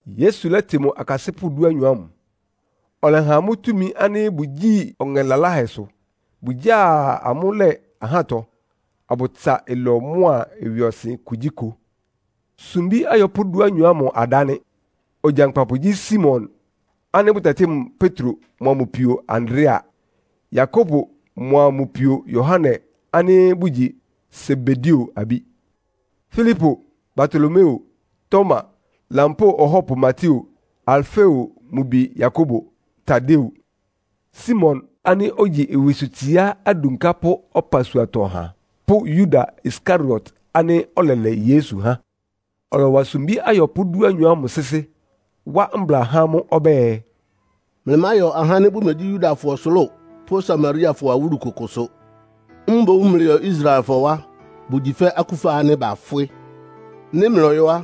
Yesu lɛ́tɩ mʋ akasɩ́pʋ́ dúanyɔ ámʋ, ɔlɛha amʋ́ túmi ánɩ́ bʋgyíi ɔŋɛ laláhɛsʋ. Bʋgyáa amʋ́ lɛ́ ahátɔ, abʋtsa ɩlɔ mʋ́a ɩwɩɔsɩn kugyíkʋ. Sumbí ayɔpʋ́ dúanyɔ ámʋ adá nɩ́: Ogyankpapʋ gyí Simon ánɩ́ bʋtɛtɩ́ mʋ Petro mʋa mʋ pio Andrea. Yakobo mʋa mʋ pio Yohane ánɩ́ bʋgyi Sebedeo abí; Filipo, Bartolomeo, Toma, lampóo ɔhɔ́pʋ Mateo, Alfeo mʋ bi Yakobo, Tadeo, Simon ánɩ́ ogyi ɩwɩsʋtsiá adunkápʋ́ ɔpasuatɔ ɔha pʋ́ Yuda Iskariot ánɩ́ ɔlɛlɛ Yesu há. Ɔlɔwa sumbí ayɔpʋ́ dúanyɔ ámʋ sɩ́sɩ́, wá mbla há amʋ́ ɔbɛ́ɛ, “Mlɩmáyɔ ahá ánɩ́ bʋmegyí Yudafɔ ɔsʋlʋ́ʋ pʋ́ Samariafɔ awúlu kʋkʋsʋ. Mboún mlɩyɔ Israelfɔ wá. Bʋgyi fɛ́ akúfa ánɩ́ bafwɩ́. Nɩ́ mlɔyɔ́ á,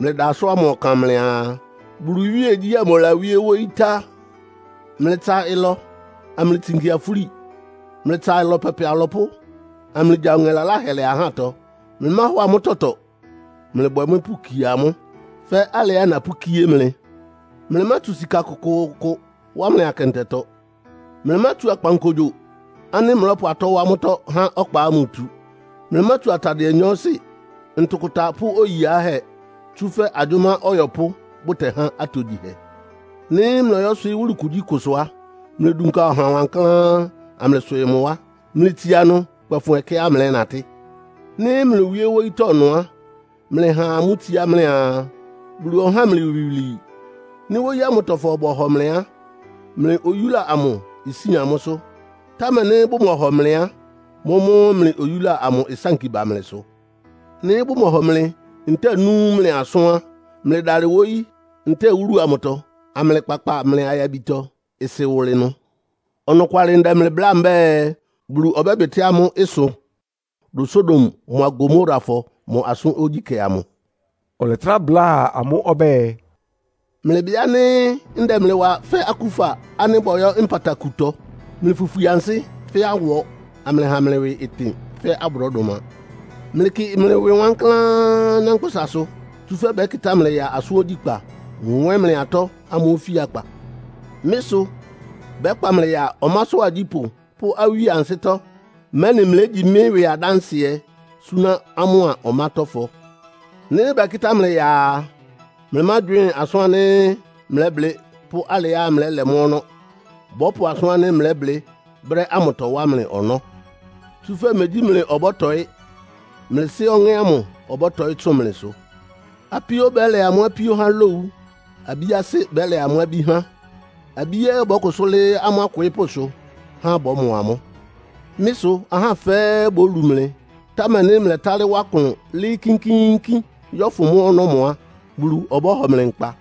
mlɩda asʋ́n ámʋ ɔkan mlɩaa, ‘Bulu iwíegyí amʋ lawíé wóyí tá.’ Mlɩtsa ɩlɔ, amlɩtsinki afúli. Mlɩtsa ɩlɔ pɛpɛ alɔpʋ́, amlɩgya ɔŋɛ laláhɛ lɛ ahátɔ. Mlɩmáhɔ amʋ́ tɔtɔ. Mlɩbwɛ mʋ́ pʋkie amʋ́, fɛ́ alɩá napʋ́kíé mlɩ. Mlɩmátsu sika kʋkʋʋkʋ wá mlɩ akɛntɛtɔ. Mlɩmátsu akpankogyo ánɩ́ mlɔ́pʋ atɔ́ wá mʋ́tɔ́ há ɔkpa ámʋ tu. Mlɩmátsu atadɩɛ nyɔɔsɩ, ntʋkʋta pʋ́ oyi yiáhɛ́. Tsúfɛ́ agyʋ́má ɔyɔpʋ́ bʋtɛhá atogyihɛ. “Nɩ́ mlɔyɔ́swɩɩ́ wúlu kugyíkʋsʋ á, mlɩdunka ɔha wankláán, amlɩswɩɩ mʋ wá. Mlɩtsia ɩnʋ kpɛfʋn ɛkɛá mlɛ́natɩ́. Nɩ́ mlowíé wóyítɔ́ ɩnʋ á, mlɩha amʋ́ itsiá mlɩaa, ‘Bulu ɔhá mlɩ iwilwii.’ Nɩ́ wóyí ámʋtɔfɔ bɔhɔ mlɩ á, mlɩ oyúla amʋ isín amʋ́sʋ́. Támɛ nɩ́ bʋmɔhɔ mlɩ á, mʋ́mʋ́ mlɩ oyúla amʋ ɩsánki ba mlɩsʋ. Nɩ́ bʋmɔhɔ mlɩ, ntɛ́ɛ nú mlɩ asʋ́n á, mlɩdalɩ wóyí ntɛ́ɛ wúlu amʋtɔ, amlɩkpakpa mlɩ ayabitɔ-ɩsɩ wʋlɩ ɩnʋ. Ɔnɔkwalɩ ndɛ mlɩ bláa mbɛ́ɛ, Bulu ɔbɛ́bɩtɩ́ amʋ́ ɩsʋ dʋn Sodom mʋ́a Gomorafɔ mʋ asʋ́n ogyíkɛ́ amʋ.” Ɔlɛtrá bláa amʋ́ ɔbɛ́ɛ, “Mlɩbɩ ánɩ́ ndɛ mlɩ wa fɛ́ akúfa ánɩ́ bɔyɔ́ nkpatakutɔ. Mlɩfwifwi ansɩ́ fɛ́ awɔ, amlɩha mlɩ ɩwɩ ɩtɩn fɛ́ abrɔ́dʋma. Mlɩkɩ mlɩ ɩwɩ wankláán anyánkpʋ́sasʋ. Tsúfɛ́ bɛ́kɩtá mlɩ ya asʋ́n ogyíkpá, nwɛ́n mlɩ atɔ́ amʋ́ ofíakpa. Mɩ́ sʋ bɛ́kpa mlɩ ya ɔmásʋ́ agyípʋ́ pʋ́ awíe ansɩ́tɔ́, mɛ́nɩ mlégyi mɩ́ ɩwɩ adánsɩɛ súná amʋ́a ɔmátɔ́fɔ. Nɩ́ bɛkɩ́tá mlɩ ya a, mlɩmágywɩ́ɩn asʋ́n ánɩ́ mlɛ́blɩ́ pʋ́ alɩá mlɛ́lɛ mʋ́ ɔnɔ́. Bɔ́pʋ asʋ́n ánɩ́ mlɛ́blɩ́ brɛ́ ámʋtɔ wá mlɩ ɔnɔ́. Tsúfɛ́ megyí mlɩ ɔbɔ́tɔɩ́. Mlɩ Sɩ́ Ɔŋɛ́ ámʋ ɔbɔ́tɔɩ́ tsʋn mlɩsʋ. “Apíó bɛ́lɛ amʋ́ apíó há lowu. Abí asɩ́ bɛ́lɛ amʋ́ abí há. Abí ɛ́ bɔ́kʋsʋ́ lɩ́ɩ́ amʋ́ akwɩɩ́pʋ́sʋ, há bɔ́mɔ amʋ́. Mɩ́ sʋ ahá fɛ́ɛ́ bólu mlɩ, támɛ nɩ́ mlɛ́talɩ́ wá klʋn lɩ́ɩ́ kínkíínkín yɔ́fʋn mʋ́ ɔnɔ́mɔ á, Bulu ɔbɔ́hɔ mlɩ nkpa.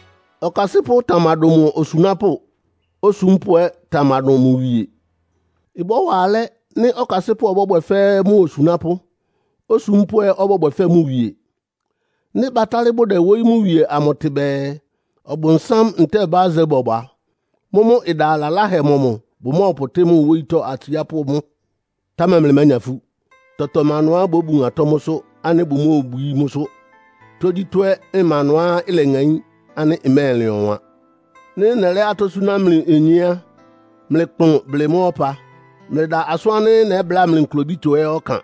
“Okasɩ́pʋ́ tamadʋn mʋ osunápʋ́. Osúmpʋ́ ɛ́ tamadʋn mʋ wie. Ɩbɔ́wa alɛ́ nɩ́ ɔkasɩ́pʋ́ ɔbɔ́bwɛ fɛ́ mʋ osunápʋ́, osúmpʋ́ ɛ́ ɔbɔ́bwɛ fɛ́ mʋ wie. Nɩ́ batálɩ́ bʋdɛ wóyí mʋ wie amʋ tɩ bɛɛ, ‘Ɔbʋnsám’ ntɛ́ɛ ‘Beelsebul’ a, mʋ́mʋ́ ɩda laláhɛ mɔmʋ bʋmɔ́ɔpʋtɩ́ mʋ wóyítɔ́ atsiápʋ́ mʋ́? “Támɛ mlɩmánya ifú. Tɔtɔ má ɩnʋá babun atɔ́ mʋ́sʋ́ ánɩ́ bʋmóobwií mʋ́sʋ́. Tógyítɔ́ ɛ́ ma ɩnʋá ileŋaín ánɩ́ ɩmɛ́ɛlɩn ɔwan. Nɩ́ nɛlɛ́ atɔ́ súná mlɩ onyé á, mlɩkplʋn blɩ mʋ́ ɔpa. Mlɩda asʋ́n ánɩ́ nɛ́bláa mlɩ nklobítɔ ɛ́ ɔkan.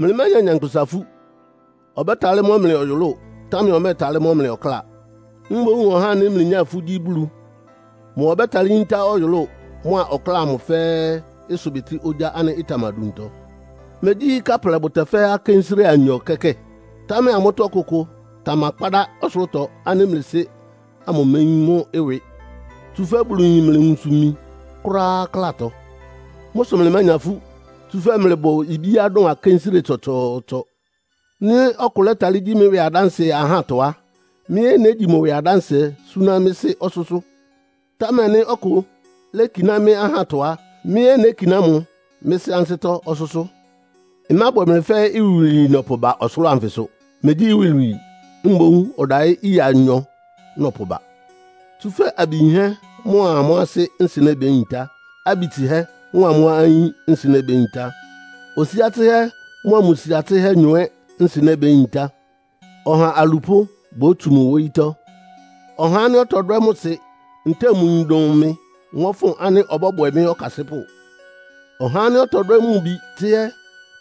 Mlɩmánya nyankpʋsa ifú. Ɔbɛ́talɩ́ mɔ́ mlɩ ɔyʋlʋ́ʋ, támɛ ɔmɛ́ɛtalɩ́ mɔ́ mlɩ ɔkláa. Mboún ɔhá ánɩ́ mlɩnyá ifú gyí Bulu. Mʋ ɔbɛ́talɩ́ yíntá ɔyʋlʋ́ʋ mʋ́a ɔkláa amʋ fɛ́ɛ́ ɩsʋbɩtɩ́ ogyá ánɩ́ ɩtamaduntɔ. Megyí káplɛ bʋtɛfɛ́ akénsire anyɔ kɛ́kɛ́? Támɛ amʋ́tɔ́ ɔkʋkʋ tamakpádá ɔsʋlʋ́tɔ ánɩ́ mlɩ Sɩ́ ámʋ méyín mʋ́ ɩwɩ. Tsúfɛ́ Bulu yin mlɩ nwunsʋ-imi kʋ́ráá klátɔ. Mʋ́ sʋ mlɩmánya ifú, tsúfɛ́ mlɩbʋ ibíá dʋn akénsire tsɔtsɔɔtsɔ.” “Nɩ́ ɔkʋ lɛ́talɩ́ gyi mɩ́ ɩwɩ adánsɩɛ ahátɔ á, mɩ́ ɛ́ négyi mʋ ɩwɩ adánsɩɛ súná mɩ́ Sɩ́ ɔsʋ́sʋ́. Támɛ nɩ́ ɔkʋ lékiná mɩ́ ahátɔ á, mɩ́ ɛ́ nékiná mʋ mɩ́ Sɩ́ ansɩ́tɔ́ ɔsʋ́sʋ́. “Ɩmábwɛ mlɩ fɛ́ iwilwii nɔpʋba ɔsʋlʋ́ʋ anfɩsʋ. Megyí iwilwii, mboún ɔdayí ɩya anyɔ nɔpʋba. Tsúfɛ́ abi yinhɛ́ mʋ́a amʋ́ asɩ́ nsɩnɛ́ béyintá. Abi tsɩhɛ́ mʋ́a amʋ́ ayín ɛ́ nsɩnɛ́ béyintá. Osia tsɩhɛ́ mʋ́a mʋ sia tsɩ́hɛ́nyɔ ɛ́ nsɩnɛ́ béyintá. Ɔha alupʋ́ bótsu mʋ wóyítɔ́. “Ɔhá ánɩ́ ɔtɔdwɛ́ mʋ sɩ ntɛ́ɛ mʋ yin dʋn mɩ mɔ́fʋn ánɩ́ ɔbɔ́bwɛ mɩ́ ɔkasɩ́pʋ́. Ɔhá ánɩ́ ɔtɔdwɛ́ mʋ bi tsɩ́hɛ́,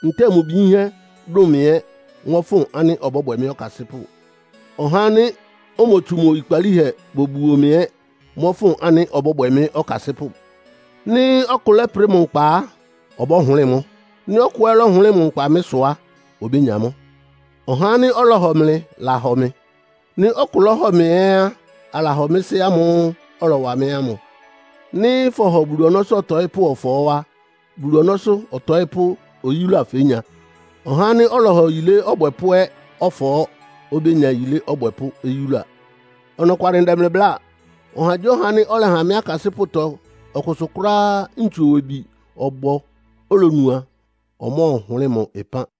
ntɛ́ɛ mʋ bi yínhɛ́ dʋn mɩ ɛ́ mɔ́fʋn ánɩ́ ɔbɔ́bwɛ mɩ́ ɔkasɩ́pʋ́. Ɔhá ánɩ́ omotsu mʋ oyikpalíhɛ bobuo mɩ ɛ́ mɔ́fʋn ánɩ́ ɔbɔ́bwɛ mɩ́ ɔkasɩ́pʋ́. Nɩ́ ɔkʋ lɛ́prɩ mʋ nkpa á, ɔbɔ́hʋlɩ́ɩ mʋ́. Nɩ́ ɔkʋ ɛ́ lɔ́hʋlɩ́ɩ mʋ nkpa mɩ́ sʋ á, obénya mʋ́. “Ɔhá ánɩ́ ɔlɔhɔ mlɩ lahɔ mɩ. Nɩ́ ɔkʋ lɔ́hɔ mɩ ɛ́ á, alahɔ mɩ́ Sɩ́ ámʋ́ʋ́ ɔlɔwa mɩ́ ámʋ. Nɩ́ fɔhɔ Bulu ɔnɔ́sʋ́ ɔtɔɩ́pʋ́ ɔfɔɔ́ á, Bulu ɔnɔ́sʋ́ ɔtɔɩ́pʋ́ oyúla fénya. Ɔhá ánɩ́ ɔlɔhɔ yilé ɔbwɛpʋ́ ɛ́ ɔfɔɔ́ obénya yilé ɔbwɛpʋ́ oyúla. Ɔnɔkwalɩ ndɛ mlɩ bláa. Ɔhagyíɔha ánɩ́ ɔlɛha mɩ́ akasɩ́pʋ́tɔ ɔkʋsʋ kʋ́ráá ntsu-owebi ɔbɔ olonu a, ɔmɔ́ɔhʋlɩ́ɩ mʋ ɩpán.”